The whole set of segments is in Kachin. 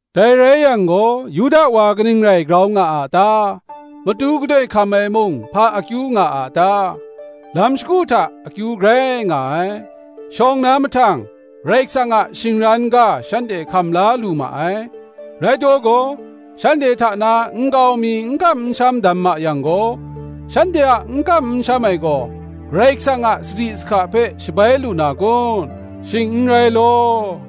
Dai rai yang gaw, Yuda wa kaning rai grau nga a ta? matu gadoi hkam ai mung, hpa akyu nga a ta? Lam shagu hta akyu grai nga ai. Shawng na mahtang, Karai Kasang a shingran ga shanhte hkam la lu ma ai. Rai taw gaw? shanhte hta na nkau mi n kam n sham dam ma yang gaw, shanhte a n kam n sham ai gaw, Karai Kasang a sadi sahka hpe shabai lu na kun? Shing n rai law: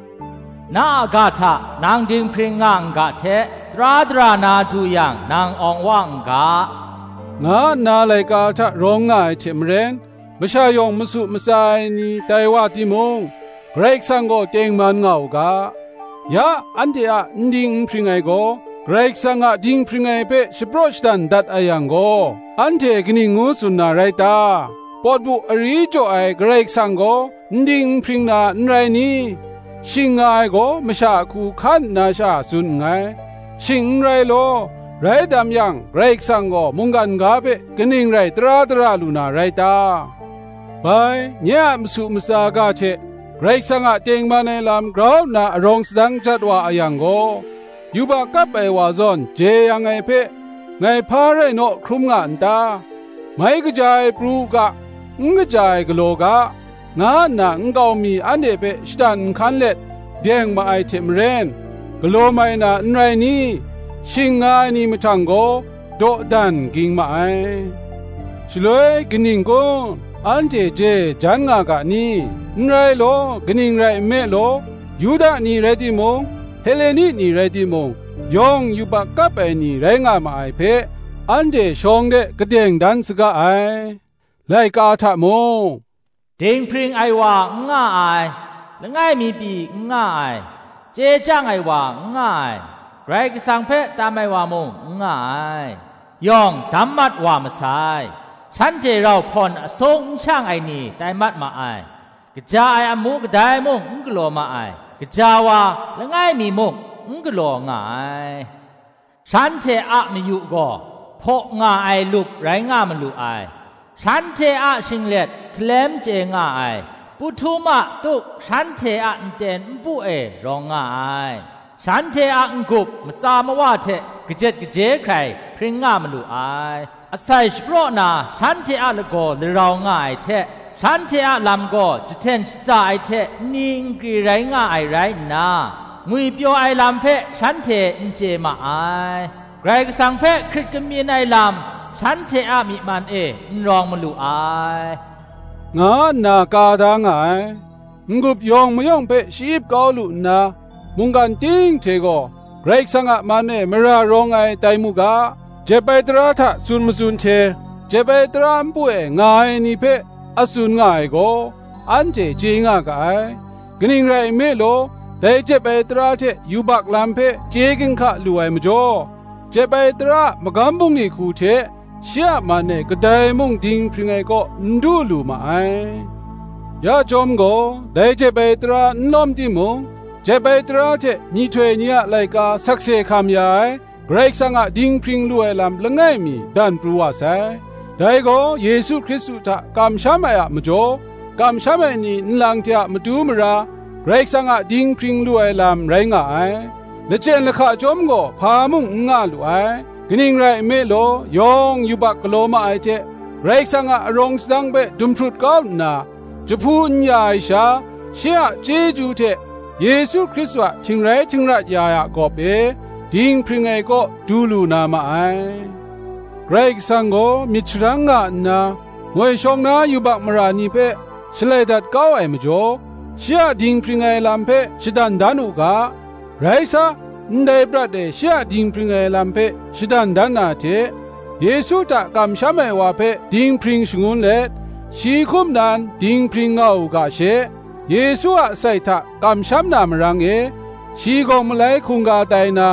“Na a ga hta nang dinghpring nga n ga hte, Tara dara na du yang, nang awng wa n ga,” nga nna laika hta rawng nga ai hte maren, masha yawng masu matsa ai ni tai wa timung, Karai Kasang gaw tengman nga u ga. Ya, anhte a n ding n hpring ai gaw, Karai Kasang a dinghpring ai hpe shapraw shadan dat a yang gaw, anhte kaning ngu tsun na rai ta? pawt bu ari jaw ai Karai Kasang gaw n ding n hpring na, n rai ni? (shing nga ai gaw, masha a hku hkan nna sha tsun nngai;) shing n rai law; rai dam yang, Karai Kasang gaw mungkan ga hpe kaning rai tara dara lu na rai ta? Bai, nye a masu matsa ga hte Karai Kasang a tengman ai lam grau nna arawng sadang jat wa a yang gaw, yubak kap ai wa zawn jeyang ai hpe, ngai hpa rai naw hkrum nga n ta? Mai kaja ai pru u ga n kaja ai galaw ga, nga nna nkau mi anhte hpe shatan nhkan let deng ma ai hte maren, galaw mai na n rai ni? shing nga ai ni mahtang gaw dawdan ging ma ai. Shaloi kaning kun? Anhte je jan nga ga ni? N rai law; kaning rai nme law, Yuda ni rai timung, Heleni ni rai timung, yawng yubak kap ai ni rai nga ma ai hpe, anhte shawng de kadeng dan saga ai. Laika hta mung, “Dinghpring ai wa n nga ai, langai mi pyi n nga ai. Chye chyang ai wa n nga ai, Karai Kasang hpe tam ai wa mung n nga ai; Yawng dam mat wa masai, Shanhte rau hpawn asung n shang ai ni tai mat ma ai. Kaja ai amu kadai mung n galaw ma ai, Gaja wa, langai mi muk n galaw nga ai.” “Shanhte a mayu gaw hpaw nga ai lup rai nga malu ai; Shanhte a shinglet hkalem chye nga ai, Pu htum a tuk shanhte a nten npu e rawng nga ai; Shanhte a n-gup matsa mawa hte kajet kaje hkrai hpring nga malu ai; Asai shapraw na shanhte a lagaw larau nga ai hte, Shanhte a lam gaw jahten shaza ai hte nni nkri rai nga ai rai nna, Ngwipyaw ai lam hpe shanhte n chye ma ai: Karai Kasang hpe hkrit kamyin ai lam, shanhte a myi man e n rawng malu ai,” nga nna ka da nga ai. N-gup yawng mayawng hpe sha-ip kau lu nna, mungkan ting hte gaw Karai Kasang a man e mara rawng ai tai nga mu ga, jep ai tara hta tsun matsun hte, jep ai tara npu e nga ai ni hpe a tsun nga ai gaw, anhte chye nga ga ai: kaning rai nme law, dai jep ai tara hte yubak lam hpe chye ginhka lu ai majaw, jep ai tara a magam bungli hku hte shi a man e kadai mung dinghpring ai kaw n du lu ma ai. Ya chyawm gaw, dai jep ai tara n lawm timung, jep ai tara hte myihtoi ni a laika sakse hkam ya ai Karai Kasang a dinghpring lu ai lam langai mi dan pru wa sai; dai gaw Yesu Hkristu hta kamsham ai a majaw, kamsham ai ni nlang hte a matu mara Karai Kasang a dinghpring lu ai lam rai nga ai: lachyen lahka chyawm gaw hpa mung n nga lu ai. Kaning rai nme law, yawng yubak galaw ma ai hte, Karai Kasang a arawng sadang hpe dumhprut kau nna, jahpu n ya ai sha, shi a chyeju hte, Yesu Hkristu a htingrai htingra ya ai a gawp e, dinghpring ai gaw du lu na ma ai. Karai Kasang gaw myit sharang nga nna moi shawng na yubak mara ni hpe shalai dat kau ai majaw, shi a dinghpring ai lam hpe shadan dan u ga; rai sa, ndai prat e shi a dinghpring ai lam hpe shadan dan na hte, Yesu hta kamsham ai wa hpe dinghpring shangun let, shi hkum nan dinghpring nga u ga she, Yesu a asai hta kamsham na marang e, shi gawng malai hkungga tai na,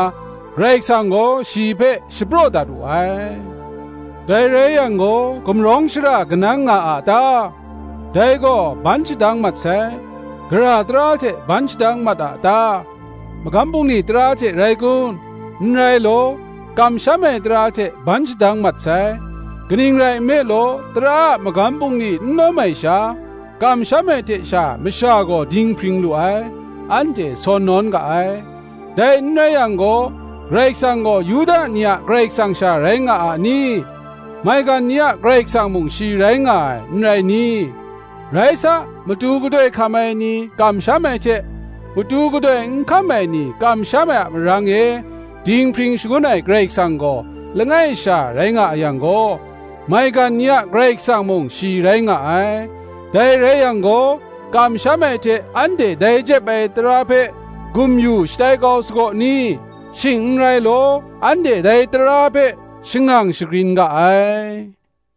Karai Kasang gaw shi hpe shapraw dat wu ai. Dai rai yang gaw, gumrawng shara kanang nga a ta? Dai gaw ban shadang mat sai. Gara tara hte ban shadang mat a ta? magam bungli tara hte rai kun? n rai law, kamsham ai tara hte ban shadang mat sai. Kaning rai nme law, tara a magam bungli n lawm ai sha, kamsham ai hte sha masha gaw dinghpring lu ai, anhte sawn nawn ga ai. Dai n rai yang gaw, Karai Kasang gaw Yuda ni a Karai Kasang sha rai nga a ni? maigan ni a Karai Kasang mung shi rai nga ai, n rai ni? Rai sa, matu gadoi hkam ai ni kamsham ai hte, matu gadoi n hkam ai ni kamsham ai a marang e, dinghpring shangun ai Karai Kasang gaw langai sha rai nga a yang gaw, maigan ni a Karai Kasang mung, shi rai nga ai. Dai rai yang gaw, kamsham ai hte anhte dai jep ai tara hpe gum-yu shatai kau sagaw ni? shing n rai law; anhte dai tara hpe shangang shagrin ga ai.